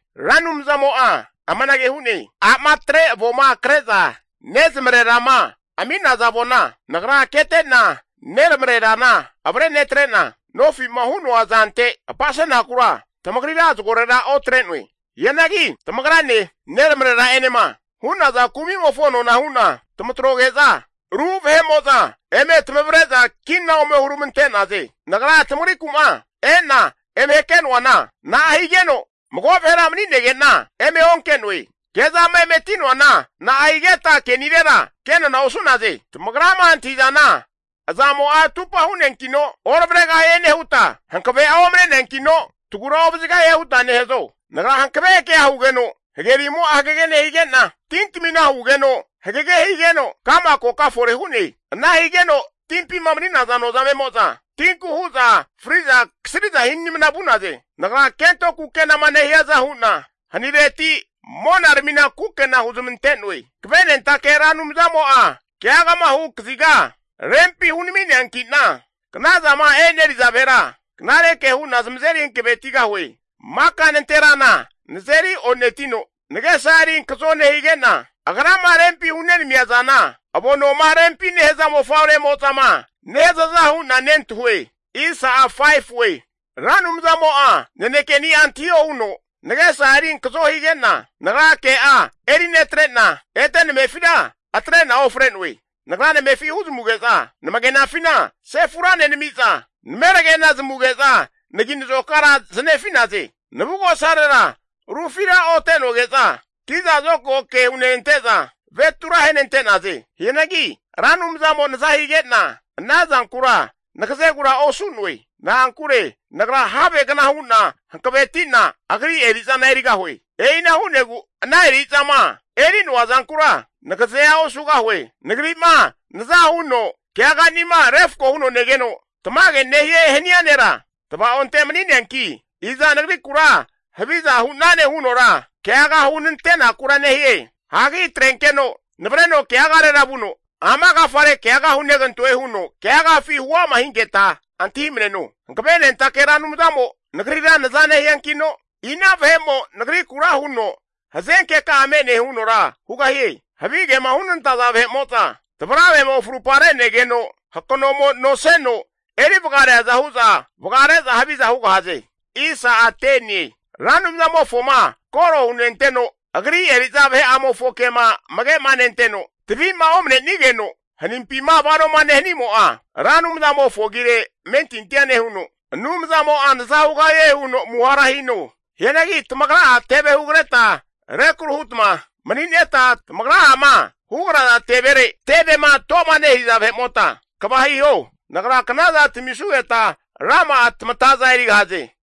Ra Anumzamo'a amanage hu'ne, A'ma atre avona kre'za nezamarera'ma ami'naza avona Nagra kete'na neramarerana avre netrena, nofi'ma hu'noa zante apasenakura tamagrira zagorera otre'noe. Hianagi tamagrane neramarera'enema hu'naza kumimofo nona hu'na tamatroge'za, ru vahe'mo'za eme tamavre'za kina ome huramante'naze. Nagra tamagriku'ma e'na eme hake'noana na'a higeno mago vahera mani'nege'na eme onke'noe. Kezama emeti'noana, na'a higeta ke'nirera, ke nona osu'naze. Tamagrama antahi'zana azamo'a atupa hu'neankino oravregahie nehuta hankave'a omane'neankino tagura ovazigahie huta nehazo? Nagra hankave kea hugeno hagerimo'a hagege nehigena, tintamina hugeno hagege higeno ka'ma koka fore hu'ne. Ana higeno timpima mani'naza nozamemo'za tinku hu'za fri'za kasriza hinimna vu'naze. Nagra kento kukenama nehiaza hu'na hanireti mona ramina kukena huzmante'noe. Hankavenentake Ra Anumzamo'a keagama hu kaziga rempi hunami'neanki'na, knazama eneriza vahera knare ke hu'na zamazeri hankavetigahue. Maka nanterana nazeri o'netino, nagesa eri ankazo nehige'na, agrama rempi hunenamia zana avonoma rempima nehaza mofavremozama nehazaza hu'na nentahue. Ra Anumzamo'a nanekeni'a antahio huno, nagesa eri ankazo hige'na nagra ke'a eri netre'na ete namefitira atre'na ofre'noe. Nagra namefi huzamuge'za, namagenafina sefura nenami'za, nameragena zamuge'za nagi'nazokara zanefi'naze. Navugosarera rufira ote'noge'za, kiza zokago ke hunenante'za avetura ahenante'naze. Hianagi Ra Anumzamo naza hige'na ana zankura nagazegura osu'noe. Na'ankure nagra havegna hu'na hankavetina agri eri'zana erigahue. E'ina hu'negu ana eri'zama eri'noa zankura nagazea osugahue. Nagri'ma nazama huno keaganima refko huno negeno tamage nehie hania nera tvaonte mani'neanki, iza nagrikura haviza hu'nane hunora keaga hunantenakura nehie? Hagi atrenkeno navareno keagarera vuno, ama agafare keaga hunegantoe huno keagafi huama hinketa antahimneno. Hankavenentake Ra Anumzamo nagrira naza nehiankino, ina vahe'mo nagrikura huno hazenkeka'a me'ne hunora hugahie. Havigema hunantaza vahe'mo'za, tvaravemo frupa re'negeno hakanomo anoseno eri vagareaza hu'za vagare'za haviza hugahaze. Ra Anumzamofoma koro hunenteno Agri eri'za vahe'amofo kema amage'ma nenteno tavima omanenigeno hanimpima vanoma nehanimo'a, Ra Anumzamofo agire amentintia nehuno, Anumzanimo'a naza hugahie huno amuhara hino. Hianagi tamagra'a teve hugreta rekru hutma manineta tamagra'ama hugraza tevere tevema toma nehiaza vahemota kva hiho. Nagra knaza tamisugeta rama'a tamataza erigahaze.